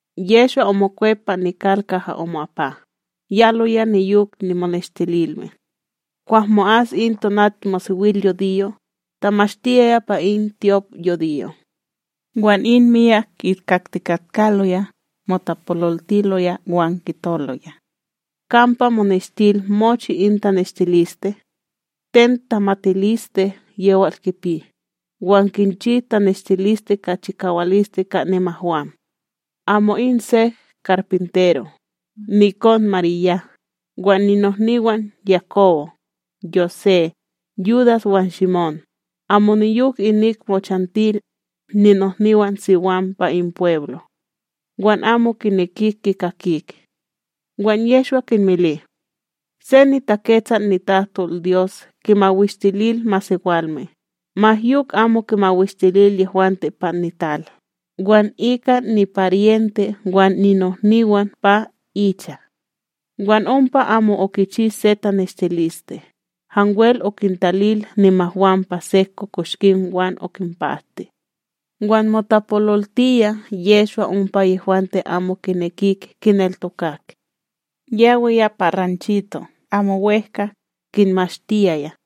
Yehshwa omokwep pa nital kaha omo'apa, yaloya niyok nimoneshtililme. Kwah mo'as in tonatmosewilyudiyo, tamashtiyaya pa in tyopYudiyo. Wan in myak kikaktikatkaloya, motapololtiloya wan kitoloya: ―Kampa omoneshtil mochi in taneshtiliste? Ten tamatiliste yewal kipi, wan kinchi taneshtiliste ka chikawaliste ka nimahwam? Amo in se karpintero, nikon Marya wan ninohniwan Yakobo, Yosé, Yudas wan Shimón, amo niyok inik mochantil ninohniwanSiwam pa in pweblo. Wan amo kinekik kikakik. Wan Yehshwa kinmili: ―Se niTaketsal nitahtolDyos kimawishtilil masewalme, ma yok amo kimawishtilil yehwante pa nital, wan ika niparyente wan ninohniwan pa icha. Wan ompa amo okichi se taneshtiliste, hanwel okintalil nimahwam pa sek kokoshkim wan okinpahti. Wan motapololtiya Yehshwa ompa yehwante amo kinekik kineltokak. Yawiya pa ranchito' amo wEhka, kinmashtiyaya.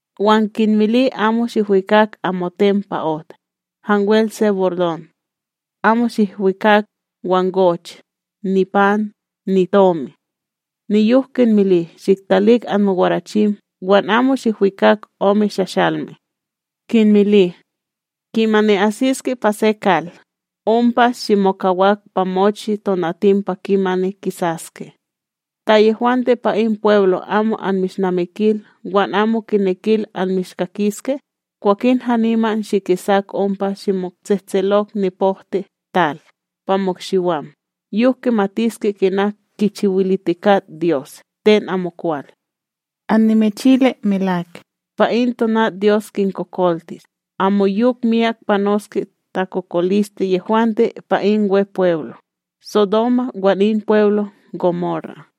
Wan kinmili amo shihwikak amoten pa ot, hanwel se bordon. Amo shihwikak wangoch, nipan, nitomi. Niyok kinmili shiktalik anmowarachim wan amo shihkwikak ome shashalme. Kinmili: ―Kimani asiske pa se kal, ompa shimokawak pa mochi tonatim pa kimani kisaske. Ta yehwante pa in pweblo amo anmishnamikil wan amo kinekil anmishkakiske, kwakin haniman shikisak ompa shimotsehtselok nipohtiTal pa mo'ikshiwam, yok kimatiske kina kichiwilitikat Dyos ten amokwal. Annimichili melak, pa in tonat Dyos kintakokoltis amoyok miyak panoske takokoliste yehwante pa in Wepweblo, Sodoma wan in Wepweblo Gomora.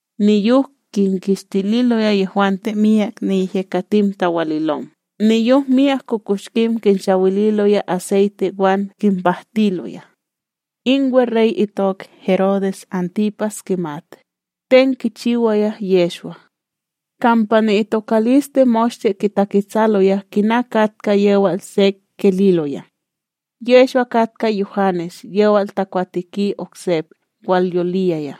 Niyok kinkishtililoya yehwante myak niyehyekatim tawalilom, niyok myak kokoshkim kinshawililoya aseyte wan kinpahtiloya. In weRey itok Herodes Antipas kimat, ten kichiwaya Yehshwa. Kampa ni'itokaliste moshte kitaketsaloya kina katka yewal sek kililoya: ―Yehshwa katka Yuhanes yewal takwateki oksep walyoliya,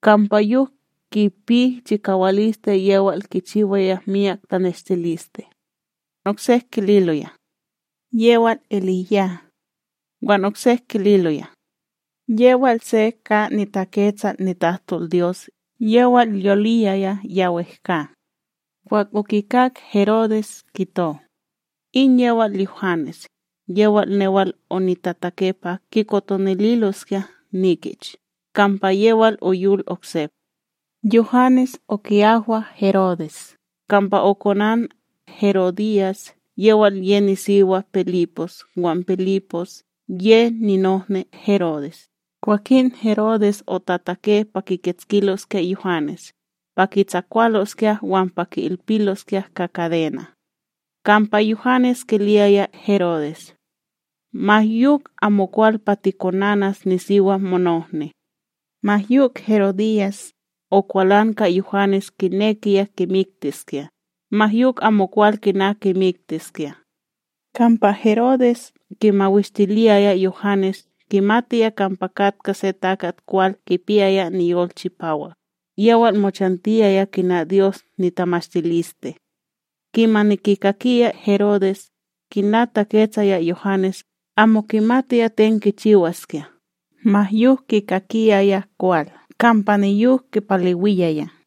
kampa yok kipi chikawaliste yewal kichiwaya myak taneshtiliste. Oksek kililoya: ―Yewal EliYah. Wan oksek kililoya: ―Yewal se ka niTaketsal nitahtolDyos yewal yoliwiya ya wehkA. Kwah okikak Herodes, kito: ―In yewal Yuhanes, yewal newal onitatake pa kikotonililoskya nikich, kampa yewal oyol oksep. Yuhanes oki'ahwa Herodes, kampa okonan Herodyas yewal ye nisiwa Pilipos wan Pilipos, ye ninohni Herodes, kwakin Herodes otatake pa kikitskiloskya Yuhanes, pa kitsakwaloskya wan pa ki'ilpiloskya ka kadena'. Kampa Yuhanes kiliyaya Herodes: ―Ma yok amokwal pa tikonanas nisiwa monohni. Ma yok Herodyas, okwalan ka Yuhanes kinekiya kimiktiskya, ma yok amokwal kina kimiktiskya; kampa Herodes kimawishtiliyaya Yuhanes kimatiya kampa katka se takat kwal kipiyaya niyol chipawak, yewal mochantiyaya kina Dyos nitamashtiliste. Kimani kikakiyaya Herodes, kina taketsaya Yuhanes amo kimatiya ten kichiwaskya ma yok kikakiyaya kwal kampa niyok kipalewiyaya.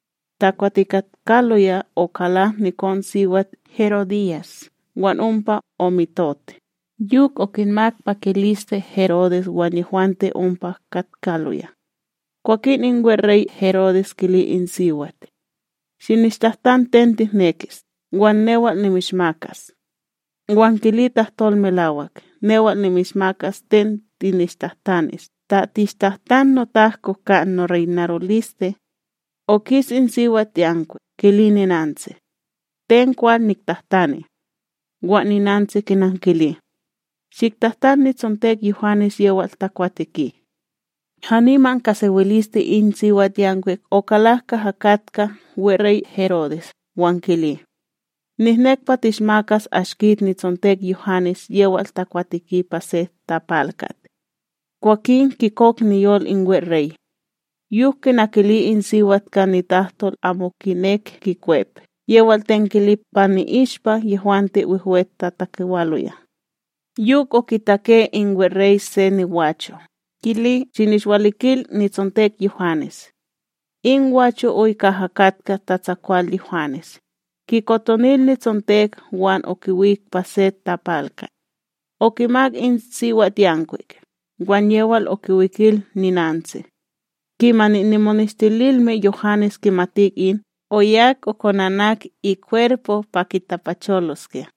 Takwatikatkaloya okalak nikonSiwat Herodyas wan ompa omitot, yok okinmak pakiliste Herodes wan yehwante ompa katkaloya. Kwakin in weRey Herodes kili in siwat: ―Shinishtahtan ten tihnekis, wan newal nimishmakas. Wan kili tahtol melawak newal nimishmakas ten tinishtahtanis, ta tinishtahtan notahko ka noreynaroliste. Okis in siwatYankwik, kili ninantsi: ―Ten kwal niktahtani? Wan ninantsi kinankili: ―Shiktahtan nitsontek Yuhanes yewal takwateki. Haniman ka isewiliste in siwatYankwik okalak kaha katka weRey Herodes, wan kili: ―Nihnek pa tinishmakas ashkit nitsontek Yuhanes yewal takwateki pa se tapalkat. Kwakin kikok niyol in weRey; yok kina kili in siwat ka nitahtol amo kinek kikwep yewal ten kili pa i'ishpa yehwante wehwe tatakewaloya. Yok okitake in weRey se nigwacho, kili shinishwalikil itsontek Yuhanes. In gwacho oy kaha katka tatsakwal Yuhanes, kikotonil nitsontek wan okiwik pa se tapalkat. Okimak in siwatYankwik, wan yewal okiwikil ninantsi. Kimani nimoneshtililme Yuhanes kimatik in, oyak konanak ikwerpo pa kitapacholoskya.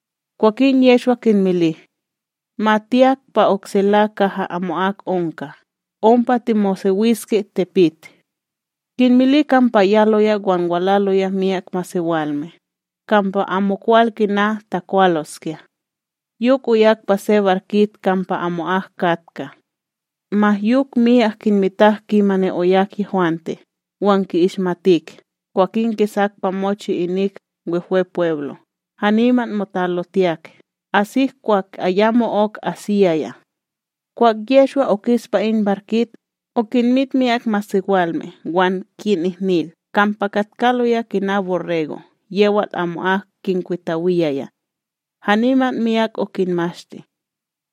Kwakin Yehshwa kinmili: ―Ma tiyak pa oksela kaha amo'ak onka, ompa timosewiske tipit. Kinmili kampa yaloya wan walaloya myak masewalme, kampa amokwal kina takwaloskya. Yok oyak pa se barkit kampa amo'ak katka. Ma yok myak kinmitak kimani oyak yehwante, wan ki'ishmatik, kwakin kisak pa mochi inik Wehwepweblo', haniman motalotiyak, asik kwah ayamo'ok asiyaya. Kwah Yehshwa okis pa in barkit, okinmit myak masewalme wan kinihnil, kampa katkaloya kina borrego' yewal amo'ak kinkwitawiyaya; haniman miyak okinmashti.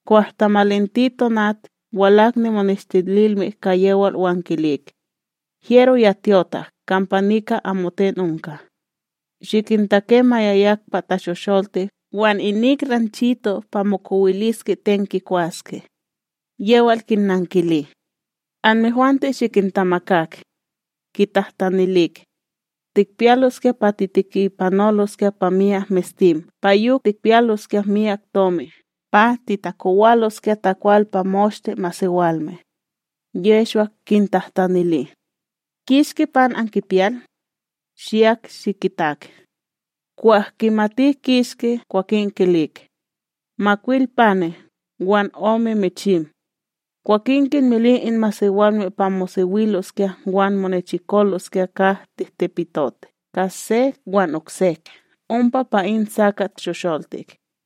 Kwah tamalinti tonat, walak nimoneshtililme ka yewal wan kilik: ―Hyero ya tyotak, kampa nika amoten onka. Shikintake ma yayak pa tashosholtik wan inik ranchito' pa mokowiliske ten kikwaske. Yewal kinnankili: ―Anmehwante shikintamakak. Kitahtatanilik: ―Tikpiyaloskya pa titikipanoloskya pa myak mestim pa yok tikpiyaloskya myak tomi pa titakowaloskya takwal pa moshte masewalme? Yehshwa kintahtanili: ―Kishki pan ankipiyal? Shiyak shikitak. Kwah kimatik kishki, kwakin kilik: ―Makwil pane' wan ome michim. Kwakin kinmili in masewalme pa mosewiloskya wan monechikoloskya ka tihtipitot ka se wan oksek ompa pa in sakat shosholtik;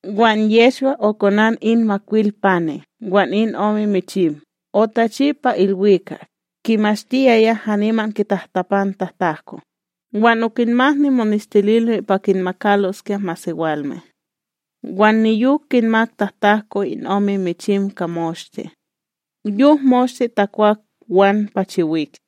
Wan Yehshwa okonan in makwil pane' wan in ome michim, otachi pa ilwikak, kimashtiyaya haniman kitahtapan tatahtahko, wan okinmak nimoneshtililme pa kinmakaloskya masewalme. Wan niyok kinmak tahtahko in ome michim ka moshte. Yok moshte takwak wan pachiwik;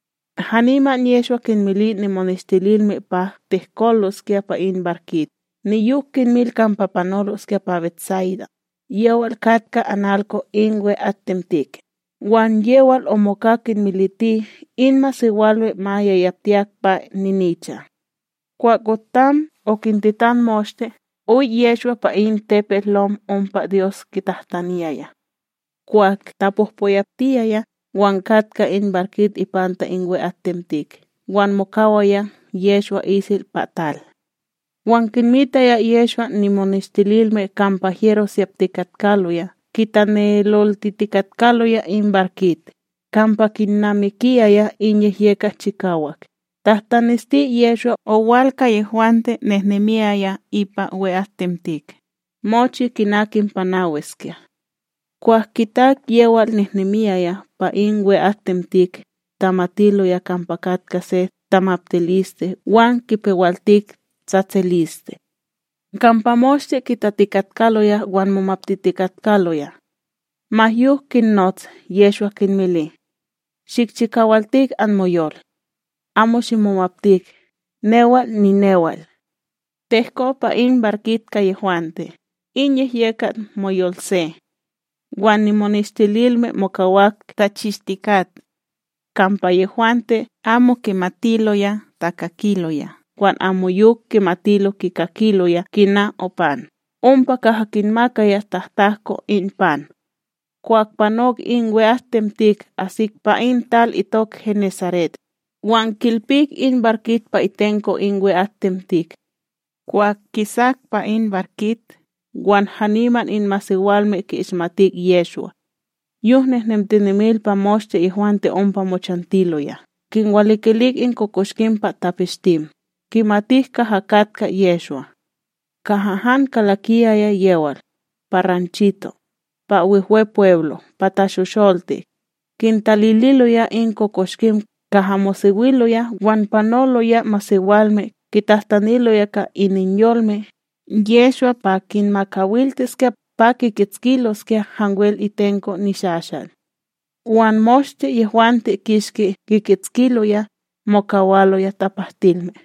Haniman Yehshwa kinmili nimoneshtililme pa tehkoloskya pa in barkit niyok kinmil kampa panoloskya pa BetSayda yewal katka analko in we'atTemtik, wan yewal omoka kinmiliti in masewalme ma yayaptiyak pa ninicha. Kwah otam okintitan moshte, oy Yehshwa pa in tepetLom ompa Dyos kitahtaniyaya. Kwah tapohpoyaptiyaya, wan katka in barkit ipanta in we'atTemtik, wan mokawaya Yehshwa isel pa tal. Wan kinmitaya Yehshwa nimoneshtililme kampa hyero siyaptikatkaloya kitaneloltitikatkaloya in barkit, kampa kinnamikiyaya in yehyekat chikawak, tahtanesti Yehshwa owal ka yehwante nehnemiyaya ipa we'atTemtik, mochi kina kinpanawiskya. Kwah kitak yewal nehnemiyaya pa in we'atTemtik, tamatiloya kampa katka se tamaptiliste wan kipewaltik tsatsiliste; kampa moshte kitatikatkaloya wan momaptitikatkaloya. Ma yok kinnots Yehshwa kinmili: ―Shikchikawaltik anmoyol; amo shimomaptik newal ninewal! Tehko pa in barkit ka yehwante, in yehyekat moyolse; wan nimoneshtililme mokawak tachishtikat. Kampa yehwante amo kimatiloya takakiloya wan ayamo'ok kimatiloya kikakiloya kina opan, ompa kaha kinmakaya tahtahko in pan. Kwah panok in we'atTemtik asik pa in tal itok Genesaret, wan kilpik in barkit pa itenko in we'atTemtik. Kwah kisak pa in barkit, wan haniman in masewalme ki'ishmatik Yehshwa. Yok nehnemtinem pa moshte yehwante ompa mochantiloya, kinwalikilik in kokoshkim pa tapeshtim, kimatik kaha katka Yehshwa. Kaha han kalakiyaya yewal, pa ranchito', pa Wehwepweblo' pa tashosholtik, kintaliloya in kokoshkim kaha mosewiloya wan panoloya masewalme kitahtaniloya ka ininyolme Yehshwa pa kinmakawaltiskya pa kikitskiloskya hanwel itenko nishashal; wan moshte yehwante kishki kikitskiloya, mokawaloya tapahtilme.